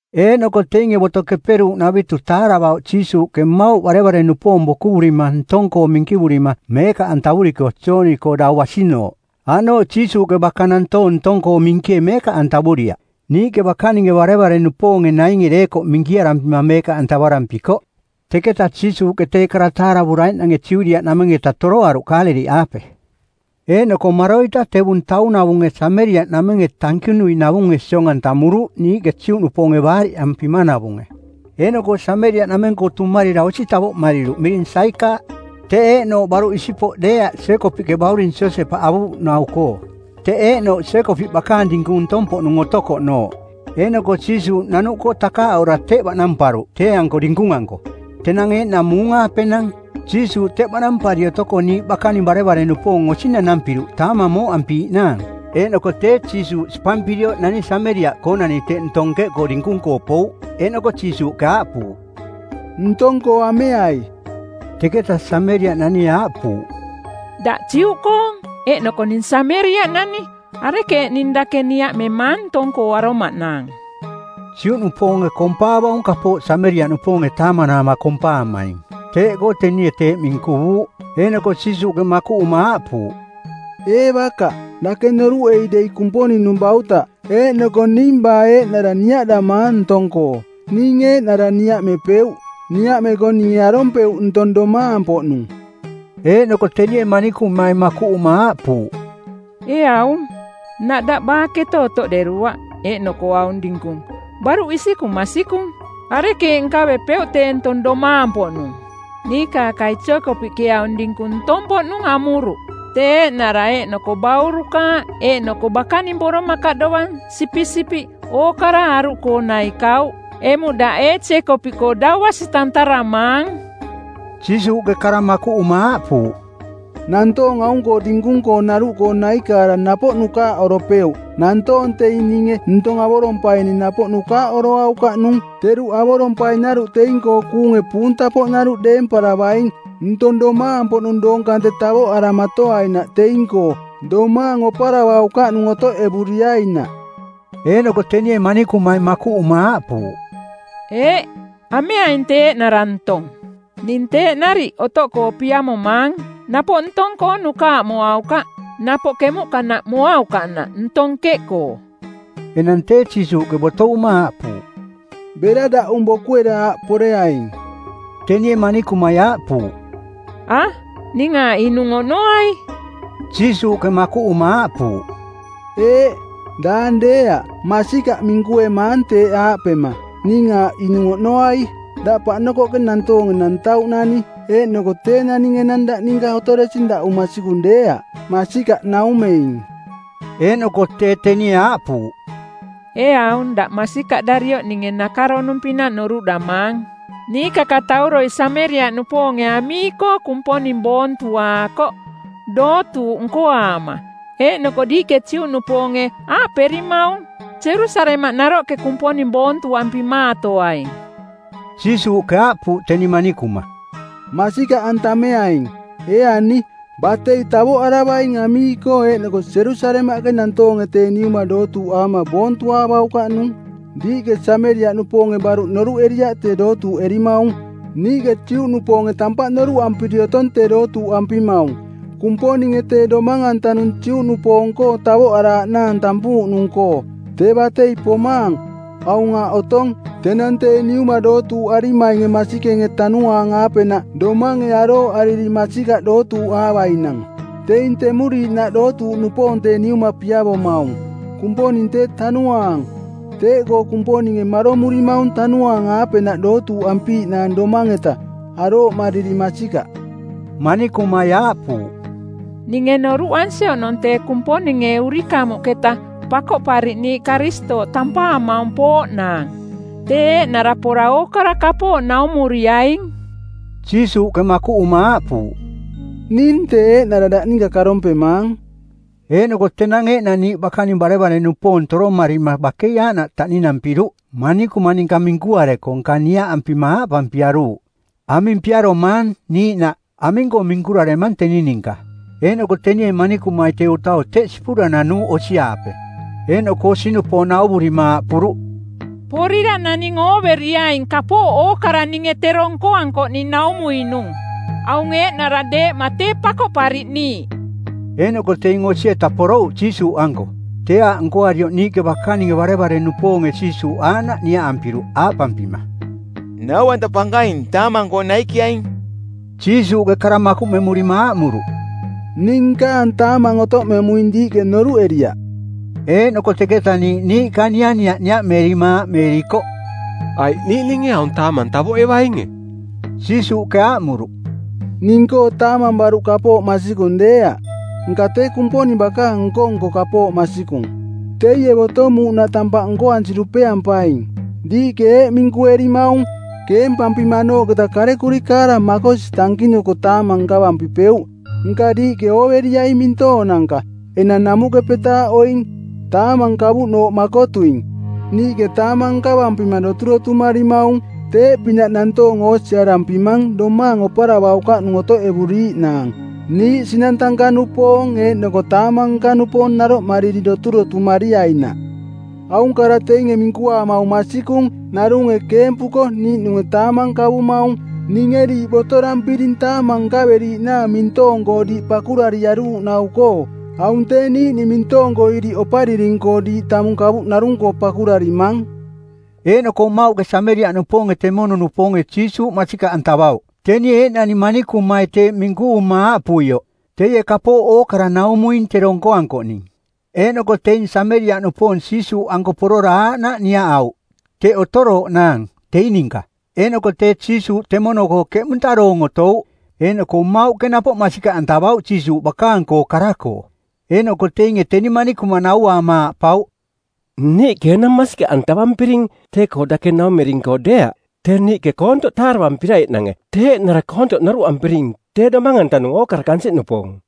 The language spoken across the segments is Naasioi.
Eeꞌnoko teinge Boto Keperuuꞌnavitu˜ taaravauꞌ Jiisuuꞌke mmauꞌ barevare-nupoong bokuvurima ntong-koo minkivurima meekaꞌantavuriko Jooni-koo dau basinooꞌ. Aꞌnooꞌ Jiisuuꞌke baka nantoong ntong-koo minkie meekaꞌantavuriaꞌ; niiꞌke bakaninge barevare-nupoonge nainge deekoꞌ minkiarampima meekaꞌantavarampikoꞌ. Teketa Jiisuuꞌke tee kara taaravuraiꞌnange Judiaꞌnameng-eta toroaruꞌ Kaaleliꞌaape. Eeꞌnoko maroita tevung taung-navunge Sameriaꞌnamenge tankinui-navunge siong-antamuruꞌ, niiꞌke Juꞌnupoonge baariꞌampimanavunge. Eeꞌnoko Sameriaꞌnameng-koo tumarira osi tavoꞌmariruꞌ miring Saikaaꞌ. Teꞌ eeꞌnooꞌ baruꞌ isipoꞌ deeaꞌ Jeekopiꞌke bauring Josepaꞌ avuuꞌnau-koo. Teꞌ eeꞌnooꞌ Jeekopiꞌ bakaang dinkung ntong-poꞌnung otokoꞌnooꞌ. Eeꞌnoko Jiisuuꞌ nanuꞌkoo takaaꞌora teꞌ baꞌnamparuꞌ tee-anko dinkung-anko. Tenang eeꞌnang muung-aapenang. Jiisuuꞌ teꞌ baꞌnampari otoko niiꞌ bakaning barevare-nupoong osi nanampiruꞌ taamang mooꞌampiiꞌnaang. Eeꞌnoko tee, Jiisuuꞌ sipampirioꞌ nani Sameriaꞌkoonani teꞌ ntong nkeꞌkoo dinkung-koo pouꞌ. Eeꞌnoko Jiisuuꞌke aaꞌpuuꞌ, “Ntong-koo ameai.” Teketa Sameriaꞌnanie aaꞌpuuꞌ, “Daꞌ Juꞌkoong, eeꞌnoko ning Sameriaꞌnani. Arekeeꞌ ning dake niaꞌmemaang ntong-koo aromaꞌnaang?” (Juꞌnupoonge kompaavaung kapooꞌ Sameriaꞌnupoonge taamanaama kompaamaing. Teeꞌkoo tenie teeꞌ minkuvuuꞌ.) Eeꞌnoko Jiisuuꞌke makuꞌuma aaꞌpuuꞌ, “Ee bakaꞌ, dake noruꞌei dei Kumponing-nung bautaꞌ eeꞌnoko ning baa eeꞌnara niaꞌdamaang ntong-koo, ning eeꞌnara niaꞌmepeuꞌ. Niaꞌmeko ninge arompeuꞌ ntong domaang-poꞌnung.” Eeꞌnoko tenie manikumai makuꞌuma aaꞌpuuꞌ, “Ee aung, nnaꞌ daꞌ baakete otoꞌderuaꞌ, eeꞌnoko aung dinkung baruꞌ isikung masikung. Arekeeꞌ nkavepeuꞌ tee ntong domaang-poꞌnung? Niikaakai Jeekopiꞌke aung dinkung ntong-poꞌnung amuruꞌ. Tee eeꞌnara eeꞌnoko baurukaaꞌ eeꞌnoko bakaning boromakaꞌ dovang sipisipiꞌ ookara aruꞌkoo naikauꞌ. Emuꞌ daꞌ ee Jeekopiꞌkoo dau basi tantaramaang?” Jiisuuꞌke kara makuꞌuma aaꞌpuuꞌ, “Nantoong aung-koo dinkung-koonaruꞌkoo naikaara napoꞌ nukaaꞌoropeuꞌ. Nantoong teing ninge ntong avorompaining napoꞌ nukaaꞌoroaukaꞌnung. Teruꞌ avorompainaruꞌ teing-koo kuunge puunta-poꞌnaruꞌ deemparavaing ntong domaang-poꞌnung doong kante tavoꞌaramatoainaꞌ teing-koo, domaang oparavaukaꞌnung otoꞌevuriainaꞌ.” Eeꞌnoko tenie manikumai makuꞌuma aaꞌpuuꞌ, “Eeꞌ, ameaing tee eeꞌnara ntong. Ning teeꞌ nariꞌ otoꞌkoo piamomaang, napoꞌ ntong-koo nukaaꞌmoaukaꞌ, napoꞌ kemuꞌkanaꞌ moaukaꞌnaꞌ ntong nkeꞌkoo.” Enang tee Jiisuuꞌke botovuma aaꞌpuuꞌ, “Bera daꞌung bokuera aꞌ poreaing.” Tenie manikumai aaꞌpuuꞌ, “A, ning aaꞌ inung oꞌnoai.” Jiisuuꞌke makuꞌuma aaꞌpuuꞌ, “Eeꞌ. Daang deeaꞌ. Masikaꞌ minkuemaang teeꞌ aaꞌpema, ‘Ning aaꞌ inung oꞌnoai.’ Daꞌ paꞌnokoꞌke nantoonge nantauꞌnani, eeꞌnoko tee naning enang daꞌ ninka otoresing daꞌung masikung deeaꞌ. Masikaꞌ naumeing.” Eeꞌnoko tee, tenie aaꞌpuuꞌ, “Ee aung, daꞌ masikaꞌdarioꞌ ninge nakaronung-pinaꞌ noruꞌdamaang. Niikakatauroi Sameriaꞌnupoonge amii-koo Kumponing boontuaakoꞌ, dootuuꞌ nkoaama; eeꞌnoko diiꞌke Juꞌnupoonge aaꞌperimaung, ‘Jerusalemaꞌ naroꞌke Kumponing boontuampimaatoaing.’” Jiisuuꞌke aaꞌpuuꞌ teni manikuma, “Masikaꞌantameaing, ee ani, batei tavoꞌaravaing amii-koo eeꞌnoko Jerusalemaꞌke nantoonge Tee Niuma dootuuꞌaama boontuaavaukaꞌnung. Diiꞌke Sameriaꞌnupoonge baruꞌ noruꞌeriaꞌ tee dootuuꞌerimaung. Niiꞌke Juꞌnupoonge tampaꞌ noruꞌampiri otong tee dootuuꞌampimaung. Kumponinge tee Domang-antanung Ju-nupoong-koong tavoꞌaraaꞌnaang tampuuꞌnung-koo. Tee batei pomaang, aung aaꞌ otong, tenang Tee Niuma dootuuꞌarimainge masikenge tanuaang-aapenaꞌ domange arooꞌariri masikaꞌ dootuuꞌaavainang. Teing temuriiꞌnaꞌ dootuuꞌnupoong Tee Niuma piavomaung. Kumponing tee Tanuaang. Teeꞌkoo Kumponinge maromurimaung tanuaang-aapenaꞌ dootuuꞌampiiꞌnaang domaang-eta, arooꞌmariri masikaꞌ.” Manikumai aaꞌpuuꞌ, “Ninge noruꞌansi oꞌnong tee Kumponinge urikamuꞌketa Pakoꞌpariꞌniiꞌ, Karistooꞌ tampaamaung pooꞌnaang. Tee eeꞌnara pora ookara kapooꞌ naumuriaing.” Jiisuuꞌke makuꞌuma aaꞌpuuꞌ, “Ning tee eeꞌnara daꞌ ninka karompemaang.” Eeꞌnoko tenang eeꞌnang niiꞌ bakaning barevare-nupoong toromarima bakei aaꞌnaꞌ taꞌninampiruꞌ manikuma ninka minkuareko, nka niaꞌampima aaꞌpampiaruuꞌ, “Aming piaromaang?” niiꞌnaꞌ “Aming-koo minkuraremang teni ninka?” Eeꞌnoko tenie manikumai tee utau teꞌ sipura nanuuꞌ osi-aape. Eeꞌnoko osi-nupoong nauvurima aaꞌpuruꞌ, “Porira naning ooveriaing kapooꞌ ookara ninge tero nkoankoꞌning naumuinung. Aung eeꞌnara deeꞌma tee Pakoꞌpariꞌniiꞌ.” Eeꞌnoko teing osi-eta porouꞌ Jiisuuꞌanko. Tee aaꞌ nkoarioꞌ niiꞌke bakaninge barevare-nupoonge Jiisuuꞌ aaꞌnaꞌ niaꞌampiruꞌ aaꞌpampima, “Nau-anta Pankaing, taamang-koo naikiaing.” Jiisuuꞌke kara makuꞌmemurima aaꞌmuruꞌ, “Ning nkaang taamang otoꞌmemuing diiꞌke noruꞌeriaꞌ.” Eeꞌnoko teketa niiꞌ niiꞌka nianiaꞌ niaꞌmeerima aaꞌmeerikoꞌ, “Aiꞌ niiꞌninge aung taamang tavoꞌevainge?” Jiisuuꞌke aaꞌmuruꞌ, “Ning-koo taamang baruꞌ kapooꞌ masikung deeaꞌ. Nka tee Kumponing bakaang nko-nko kapooꞌ masikung. Teie botomuuꞌnaꞌ tampaꞌ nkoansi dupeampaing. “Diiꞌke eeꞌ minkuerimaung, ‘Keempampimanooꞌketa karekuri kaara makosi tankinuko taamang nkavampipeuꞌ.’ Nka diiꞌke ooveriaing mintoonanka. Enang namuꞌke petaaꞌoing, taamang kavuꞌnooꞌ makotuing. Niiꞌke taamang nkavampima doturotumarimaung. Teeꞌpinaꞌ nantoong oosiarampimang domaang oparavaukaꞌnung otoꞌevuriiꞌnaang, niiꞌ sinang tanka-nupoong eeꞌnoko taamang nka-nupoong naroꞌmariri doturotumariainaꞌ. Aung kara teinge minkuaamaung masikung, ‘Narunge keempuko niiꞌnunge taamang kavumaung.’ Ninge diiꞌ botorampiring taamang nkaveriiꞌnaang mintoong-koo diiꞌ pakurariaruuꞌnau-koo. Aung tee niiꞌning mintoong-koo iriꞌopariring-koo diiꞌ tamung kavuꞌ narung-koo pakurarimang.” Eeꞌnoko mmauꞌke Sameriaꞌnupoonge temono-nupoonge Jiisuuꞌ masikaꞌantavauꞌ, tenie eeꞌnani manikumai teeꞌ minkuvuma aaꞌpuioꞌ, “Teie kapooꞌ ookara naumuing tero nkoankoꞌning.” Eeꞌnoko teing Sameriaꞌnupoong Jiisuuꞌanko porora aaꞌnaꞌ niaꞌauꞌ teꞌ otorooꞌnaang teing ninka. Eeꞌnoko tee Jiisuuꞌ temono-koo keꞌmunta doong otouꞌ. Eeꞌnoko mmauꞌke napoꞌ masikaꞌantavauꞌ Jiisuuꞌ bakaang-koo kara-koo. Eeꞌnoko teinge teni manikuma nauaama aaꞌpauꞌ, “Niiꞌke enang masikaꞌantavampiring tee-koo dake naumering-koo deeaꞌ, tee niiꞌke koontoꞌ taaravampiraiꞌnange. Tee eeꞌnara koontoꞌ noruꞌampiring tee Domang-antanung ookara kansiꞌnupoong.”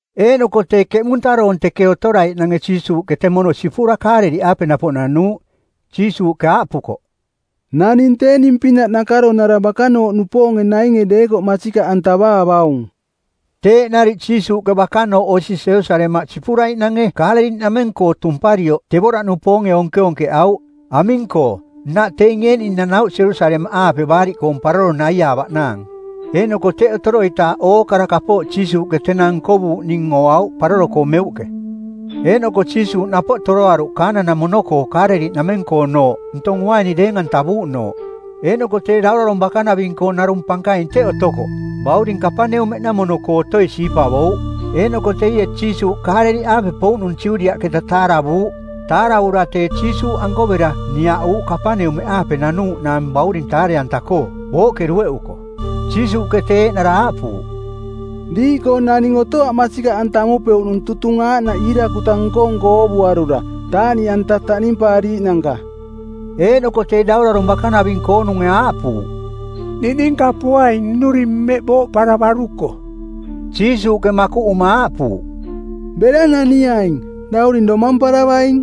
Eeꞌnoko tee, keꞌmunta doong teꞌ otoraiꞌnange Jiisuuꞌke temono sipura Kaaleliꞌaape napoꞌ nanuuꞌ. Jiisuuꞌke aaꞌpukoꞌ, “Naning tee ning-pinaꞌ nakaronara bakanooꞌnupoonge nainge deekoꞌ masikaꞌantavaavaung.” Teeꞌ nariꞌ Jiisuuꞌke bakanooꞌ osi Jerusalemaꞌ sipuraiꞌnange Kaaleliꞌnameng-koo tumparioꞌ tevoraꞌnupoonge onkeonkeꞌauꞌ. Aming-koo, nnaꞌ teing eeꞌning nanauꞌ Jerusalemaꞌaape Baariꞌkoong Paroro naiaavaꞌnaang, eeꞌnoko teꞌ otoroitaaꞌ ookara kapooꞌ Jiisuuꞌke tenang nkovuuꞌning ooauꞌ paroro-koo meuꞌke. Eeꞌnoko Jiisuuꞌ napoꞌ toroaruꞌ Kana-namono-koo Kaaleliꞌnameng-koonooꞌ, ntong uaini deeng-antavuuꞌnooꞌ. Eeꞌnoko tee daurarong bakanaving-koong narung pankaing teꞌ otokoꞌ, bauring Kapaneumeꞌnamono-koo otoi siipavouꞌ. Eeꞌnoko teie Jiisuuꞌ Kaaleliꞌaape pouꞌnung Judiaꞌketa taaravuuꞌ. Taaravura tee, Jiisuuꞌanko bera, niaꞌuuꞌ Kapaneumeꞌaape nanuuꞌnaang bauring taare-anta-koo, booꞌke dueꞌuko. Jiisuuꞌke tee eeꞌnara aaꞌpuuꞌ, “Diiꞌkoo naning otoaꞌ masikaꞌantamepeuꞌnung tutung aaꞌnaꞌ iirakuta nko-nko oovuarura, taaꞌniꞌanta taꞌnimpaariiꞌnanka.” Eeꞌnoko tee daurarong bakanaving-koonunge aaꞌpuuꞌ, “Niꞌninka poaing nnuring mmeꞌ booꞌparavaruko.” Jiisuuꞌke makuꞌuma aaꞌpuuꞌ, “Bera naniaing. Dauring domamparavaing.”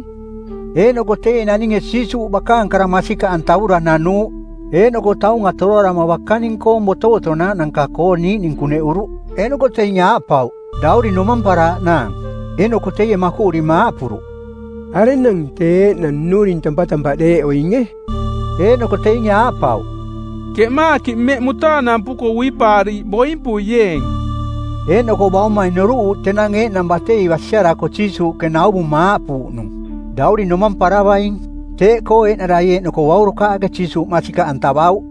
Eeꞌnoko teie naninge Jiisuuꞌ bakaang kara masikaꞌantavura nanuuꞌ. Eeꞌnoko taunga toroarama bakaning-koong botovotonaaꞌnanka-koo niiꞌning kuneꞌuruꞌ. Eeꞌnoko teinge aaꞌpauꞌ, “Dauring domamparaaꞌnaang.” Eeꞌnoko teie makuꞌurima aaꞌpuruꞌ, “Arenang tee eeꞌnang nnuring tampatampaꞌ deeꞌoinge?” Eeꞌnoko teinge aaꞌpauꞌ, “Keꞌmaakiꞌ mmeꞌ mutaanampuko uipaariiꞌ boimpuieeng.” Eeꞌnoko baumai noruꞌuuꞌ tenang eeꞌnang batei basiarako Jiisuuꞌke nauvuma aaꞌpuuꞌnung, “Dauring domamparavaing.” Teeꞌkoo eeꞌnarai eeꞌnoko baurukaaꞌke Jiisuuꞌ masikaꞌantavauꞌ.